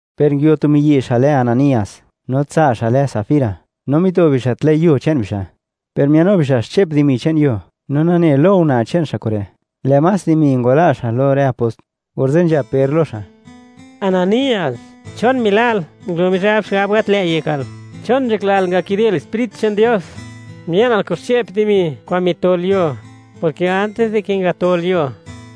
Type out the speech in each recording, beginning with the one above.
Per nguio tu miyi' xa' lë Ananías, no tsa' xa' lë Safira, no mito bixa' tlë' yuo che'n bixa'. Per mia'nnu bixa' xche'p dimi che'n yuo, no nane lo una' che'n xa' kure', lë' más dimi ngwala' xa' lo rë apost. Orze' nzhab Per lo xa': ―Ananías, ¿chon mila'l ngulo Mizhab xigab gat lë't yekal? ¿Chon nzhaklal ngakidel Sprit che'n Dios?, mia'nal kun xche'p dimi kwa'n mitol yuo, porke antis dike ngatol yuo,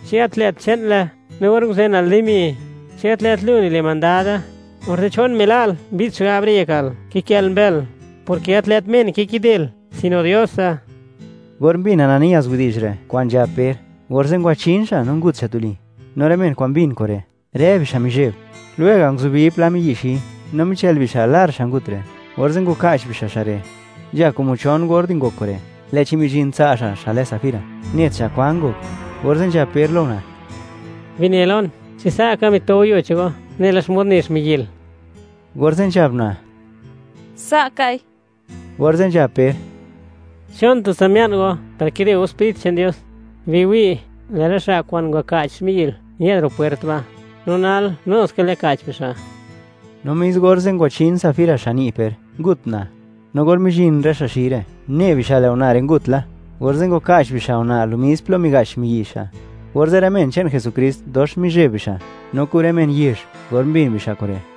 ¿chi gat lë't che'nle? No or nguzenal dimi, ¿chi gat lë't lu nile' mandade? Orze', ¿chon mila'l mbi'd xigab re' yekal, kikë'l mbël?, porke gat lë't men kikidel, sino Diose. Or mbin Ananías widi'zh re', kwa'n nzhab Per, orze' ngwachin xa' no ngut xa' tuli. No rë men kwa'n mbin kure', rë bixa' mizheb. Lwega' nguzubi pla miyi' xi, no michël bixa' lar xa' ngut re', orze' ngwaka'ch bixa' xa' re'. Nzha como chon or di ngok kure', lë'chi mizhin tsa' xa', xa' lë Safira, net xa' kwan ngok. Orze' nzhab Per lo una': ―Bine lon, ¿chi sa'ka mito go yuo che'n go, nela xmod ne xmiyi'l? Orze' nzhab una': ―Sa' kai. Orze' nzhab Per: ―¿Chon tutsa mia'n go par kide go Sprit che'n Dios? Biwi', lë' rë xa' kwa'n ngwaka'ch xmiyi'l ñë'd la ro' pwert ba'. No nal, nuskal yaka'ch bixa'. No mis orze' ngwachin Safira xan ni' Per, ngut una'. No or mizhin rë xa' xi re', une bixa' lë' una' re' ngut la, orze' ngwaka'ch bixa' una' lo mis plo miga'ch xmiyi' xa'. Orze' rë men che'n Jesukrist dox mizheb bixa', no kun rë men yezh, or mbin bixa' kure'.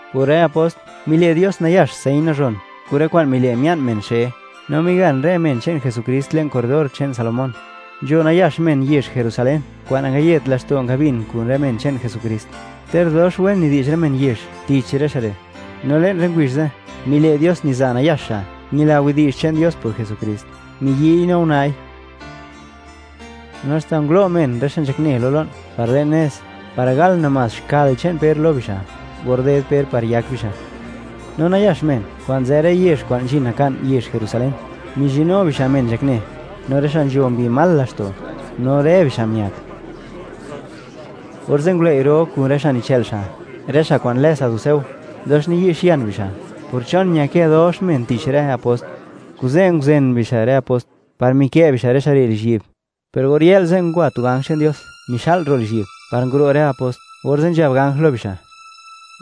Por rë apost, mile' Dios nayax señ nazhon kun rë kwa'n mile' mia'n men xe. No migan rë men che'n Jesukrist le'n corredor che'n Salomón. Nzho nayax men yezh Jerusalén kwa'n nangayet laxto' ngabin kun rë men che'n Jesukrist, ter dox wen nidi'zh rë men yezh tich rë xa' re'. No le'n rë ngubizh ze', mile' Dios niza nayax xa' ñila widi'zh che'n Dios por Jesukrist, miyi'y no una'i. No haxta ngulo' men, rë xa' nzhakne lo lo'n par le'n nez, par gal namás xkal che'n Per lo bixa', or ded Per, par yak bixa'. No nayax men kwa'n nzë rë yezh kwa'n nzhin naka'n yezh Jerusalén, mizhinnu bixa' men nzhakne, no rë xa' nzho mbi mal laxto'. No rë bixa' miak. Orze' ngulëi' ro kun rë xa' nichë'l xa', rë xa' kwa'n lë saduceo, dox niyi'xian bixa' por ¿chon ñakë dox men tich rë apost? Kuze' nguzen bixa' rë apost, par mikë' bixa' rë xa' re' lizhyi'b. Per or yë'l ze', ngwa tu ganj che'n Dios mixa'l ro' lizhyi'b, par nguro' rë apost, orze' nzhab ganj lo bixa':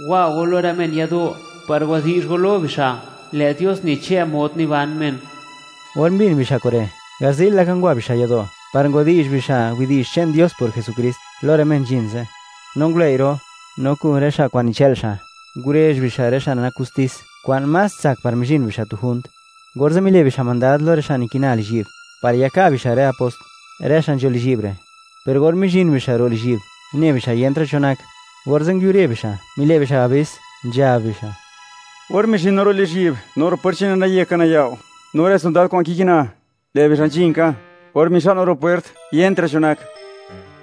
―Wa go lo rë men yado', par wadi'zh go lo bixa', lë' Dios nichë' mod niban men. Or mbin bixa' kure', garzi'l laka ngwa bixa' yado' par ngwadi'zh bixa' widi'zh che'n Dios por Jesukrist lo rë men nzhin ze'. No ngulëi' ro', no kun rë xa' kwa'n nichë'l xa', ngurezh bixa' rë xa' nak gustis kwa'n más tsak par mizhin bixa' tu junt. Orze' mile' bixa' mandad lo rë xa' nikina lizhyi'b, par yaka' bixa' rë apost, rë xa' nzho lizhyi'b re'. Per or mizhin bixa' ro' lizhyi'b, une bixa' yentra' cho nak; orze' nguiubre' bixa', mile' bixa' abis, nzhab bixa': ―Or mizhin no ro' lizhyi'b, no ro' pwert che'ne naye ka nayao', no rë sondad kwa'n nikina, lë' bixa' nzhin ka; or mixa'l no ro' pwert, yentra' cho nak.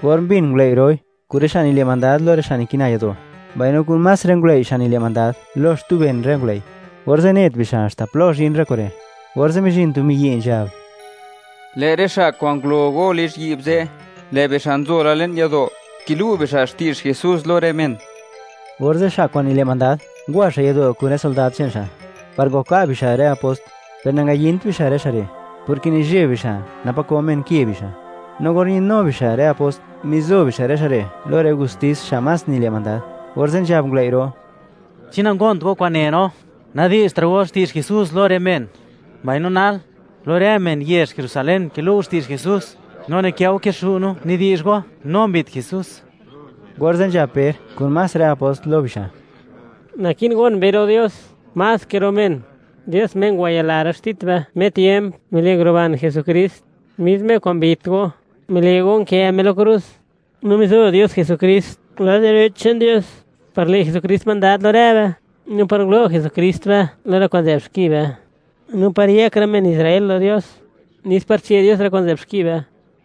Or mbin ngulëi' roi, kun rë xa' nile' mandad lo rë xa' nikina yado', mbaino kun más rë ngulëi' xa' nile' mandad lo xtu ben rë ngulëi'; orze' net bixa' haxta plo zhin rë kure', orze' mizhin tu miyi', nzhab: ―Lë' rë xa' kwa'n ngulo go lizhyi'b ze', lë' bixa' nzo la le'n yado', kilu' bixa' xti'zh Jesús lo rë men. Orze' xa' kwa'n nile' mandad, ngwa xa' yado' kun rë sondad che'n xa', par ngwaka' bixa' rë apost. Per nangayint bixa' rë xa' re', porke nizheb bixa', napa' ko men ke bixa'. No or ñë'dnu bixa' rë apost, mizo bixa' rë xa' re' lo rë gustis xa' más nile' mandad, orze' nzhab ngulëi' ro': ―¿Chi nangont go kwa'n ne no, nadi'zhtra' go xti'zh Jesús lo rë men? Mbaino nal, ¡lo rë men yezh Jerusalén kilu' go xti'zh Jesús! No nikë' go kixu' no, nidi'zh go, ¡no mbit Jesús! Orze' nzhab Per, kun más rë apost, lo bixa': ―Naki'n gon be ro' Dios, más ke ro' men. Dios, Me ngwayila rë xtit be, me tiemp, mile' nguruban Jesukrist, mis Me kwa'n mbit go, mile' go nkë Me lo krus. No mizo Dios Jesukrist lad direch che'n Dios, par le' Jesukrist mandad lo rë be, no par ngulo' Jesukrist be lo rë kwa'n nzë'b xki be, no par yëk rë men Israel lo Dios, nes par che' Dios rë kwa'n nzë'b xki be.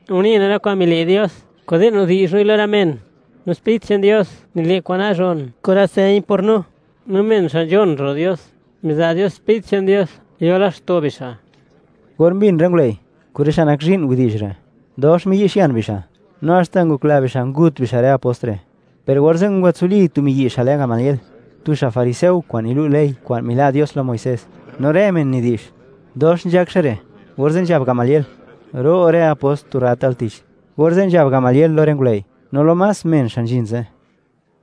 Une no rë kwa'n mile' Dios, kuze' nidi'zh noi lo rë men. No Sprit che'n Dios nile' kwa'n nazhon kun rë señ por no. No men xa' nzhon ro' Dios, niza' Dios Sprit che'n Dios, yo laxto' bixa'. Or mbin rë ngulëi', kun rë xa' nak zhi'n, widi'zh re', dox miyi'xian bixa', no haxta ngokla bixa' gut bixa' rë apost re'. Per orze' ngwatsuli tu miyi' xa' lë Gamaliel, tu xa' fariseo kwa'n nilu' ley kwa'n mila' Dios lo Muisés, no rë men nidi'zh: “Dox nzhak xa' re'.” Orze' nzhab Gamaliel: “Ro' rë apost tu rrat al tich.” Orze' nzhab Gamaliel lo rë ngulëi', no lo más men xa' nzhin ze':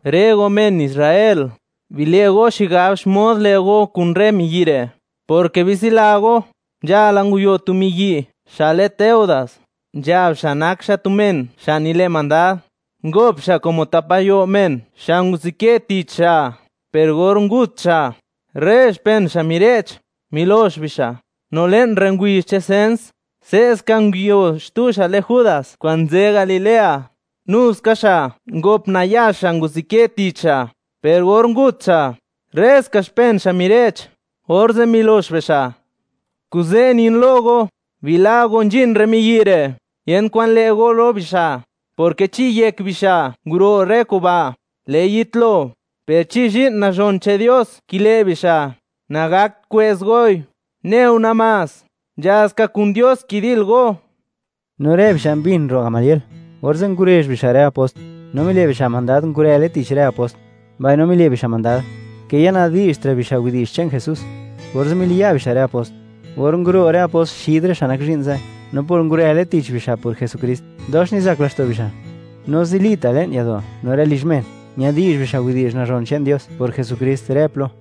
―Rë go, men Israel; bile' go xigab xmod le' go kun rë miyi' re', porke bitsila go, nzhala, nguio tu miyi' xa' lë Teudas; nzhab xa' nak xa' tu men xa' nile' mandad, ngop xa' como tap gayo' men, xa' nguzukë tich xa', per or ngut xa', rë xpen xa' mire'ch, milox bixa'. No le'n rë ngubizh che'n sens, se'ska nguio xtu xa' lë Judas kwa'n nzë Galilea. Nuska xa' ngop nayax xa' nguzukë tich xa', per or ngut xa', rë ska xpen xa' mire'ch, orze' milox bixa'. Kuze' nin lo go; bila' go nzhin rë miyi' re', yent kwan le' go lo bixa', porke chi yek bixa' nguro' rë kuba', lë'i yitlo. Per chi zhi'n nazhon che'n Dios kile' bixa', nagakt kwë'z goi, neu namás, nzha ska kun Dios kidil go. No rë bixa' mbin ro' Gamaliel. Orze' ngurezh bixa' rë apost, no mile' bixa' mandad ngurële tich rë apost, mbaino mile' bixa' mandad, ke ya nadi'zhtra' bixa' widi'zh che'n Jesús. Orze' miliya' bixa' rë apost. Or nguro' rë apost xid rë xa' nak zhi'n ze', no por ngurële tich bixa' por Jesukrist, dox nizak laxto' bixa'. No zilita', le'n yado', no rë lizh men, ñadi'zh bixa' widi'zh nazhon che'n Dios por Jesukrist rë plo.